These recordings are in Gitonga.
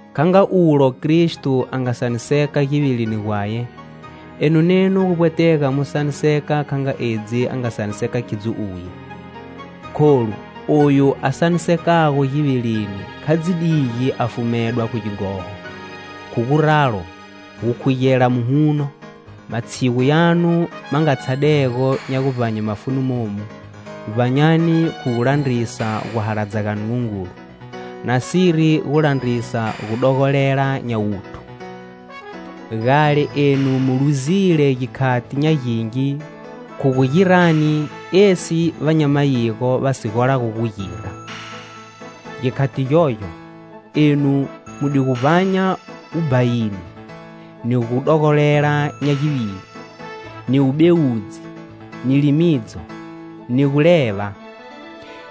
Kha nga ulo Kristo a nga saniseka givilini gwaye, enu nenu gu vbwetega mu saniseka kha nga edzi a nga saniseka khidzo uye. Kholu, oyu a sanisekago givilini kha dzi digi a fumedwa khu gighoho. Khu guralo, gukhugela muhuno matshigu yanu ma nga tshadego nya guvbanye mafuni momu, vbanyani khu gu landrisa guhaladza ga Nungungulu, nasiri gu landrisa gudogolela nya wuthu. Gale enu mu luzile gikhati nya gingi khu gu girani esi va nya mayigo va si golago gu gira. Gikhati gyogyo, enu mu di gu vbanya wubhayini, ni gudogolela nya givili, ni wubewudzi, ni limidzo, ni guleva,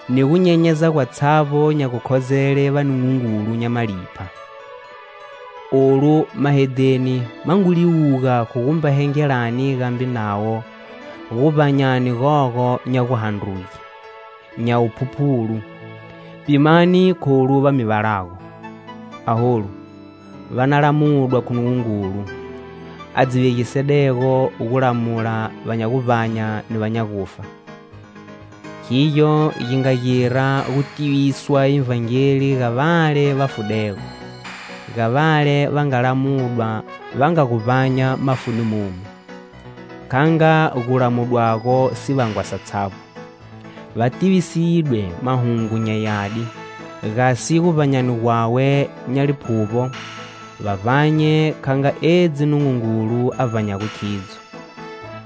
ni gunyenyeza gwatshavbo nya gukhozele vanungungulu nya malipha. Olu, mahedheni ma ngu liwuga khu gumba hengelani gambe navo guvbanyani gogo nya guhandruge, nya wuphuphulu; pimani kholu va mi valago. Aholu va na lamudwa khu Nungungulu, a dzi vegisedego gulamula va nya guvbanya ni va nya gufa. Khigyo gi nga gira gu tiviswa Ivhangeli ga vale va fudego, ga vale va nga lamudwa va nga gu vbanya mafuni momu, kha nga gulamudwago sivangwa satshavbo. Va tivisidwe Mahungu nya Yadi gasi, guvbanyani gwawe nya liphuvbo, va vbanye kha nga edzi Nungungulu a vbanyago khidzo.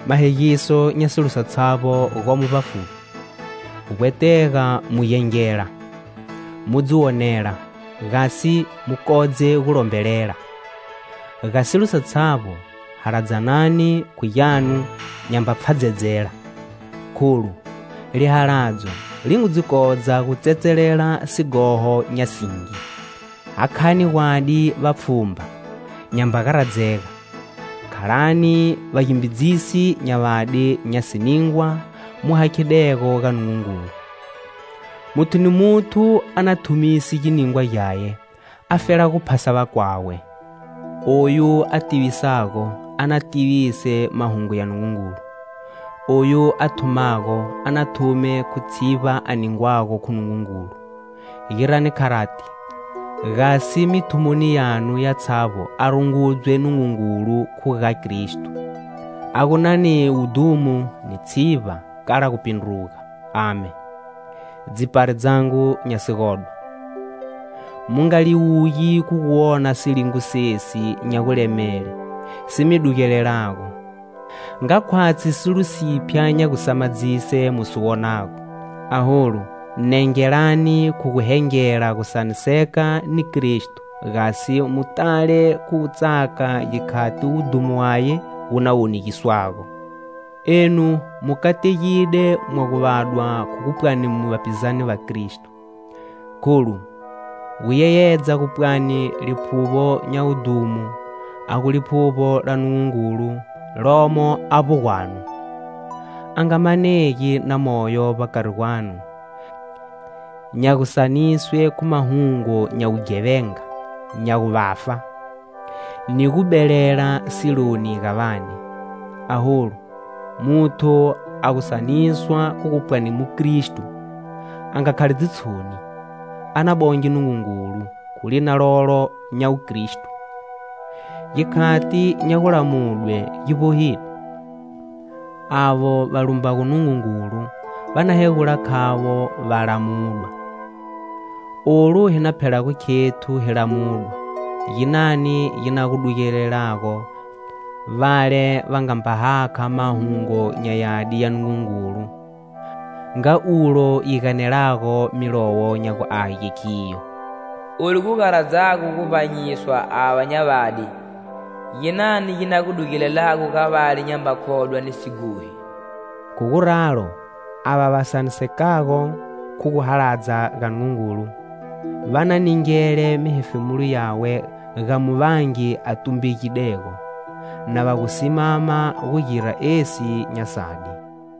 Mahegiso nya silo satshavbo gomo vbafuvbi. Gu vbwetega mu gengela, mu dzi wonela, gasi mu kodze gu lombelela. Ga silo satshavbo, haladzanani khu gyanu nyamba pfhadzedzela, kholu, lihaladzo li ngu dzi kodza gu tsetselela sighoho nya singi. Hakhani gwadi vapfhumba, nyamba garadzega. Khalani vagimbidzisi nya vadi nya siningwa mu hakhidego ga Nungungulu. Muthu ni muthu a na thumise giningwa gyaye afela gu phasa vakwawe. Oyu a tivisago, a na tivise Mahungu ya Nungungulu. Oyu a thumago, a na thume khu tshivba a ningwago khu Nungungulu. Girani kharati gasi mithumoni yanu yatshavbo a rungudzwe Nungungulu khu ga Kristo, a gu na ni wudhumo ni tshivba kala gupindruga! Amen. Dzipari dzangu nya sigodwa, mu nga liwugi khu gu wona silingo sesi nya gulemele si mi dugelelago, nga khwatshi silo siphya nya gusamadzise mu si wonago. Aholu, nengelani khu gu hengela gusaniseka ni Kristo gasi mu tale khu gutsaka gikhati wudhumo waye wu na wonegiswago. Enu mu kategide mwa gu vadwa khu gu pwani mu vapizane va Kristo, kholu, gu yeyedza gu pwani Liphuvbo nya wudhumo a gu Liphuvbo la Nungungulu lomo avbo gwanu. A nga manegi na moyo vbakari gwanu nya gusaniswe khu mahungu nya wughevenga, nya wuvafa, ni gubelela siloni ga vane. Aholu, muthu a gu saniswa khu gu pwani mukristo, a nga khali dzitshoni, a na bonge Nungungulu, khu lina lolo nya Wukristo. Gikhati nya gulamudwe gi vbohile. Avo va lumbago Nungungulu va na hegula khavo va lamudwa. Olu hi na phelago khethu hi lamudwa, ginani gi na gu dugelelago vale va nga mba hakha Mahungu nya Yadi ya Nungungulu. Nga ulo yi ganelago Milowo nya gu Age khiyo. "Olu gu garadzago gu vbanyiswa ava nya vadi, ginani gi na gu dugelelago ga vale nyamba khodwa ni sighohi?" Khu guralo, ava va sanisekago khu guhaladza ga Nungungulu, va na ningele mihefemulo yawe ga Muvangi a tumbegidego, na va gu simama gu gira esi nya sadi.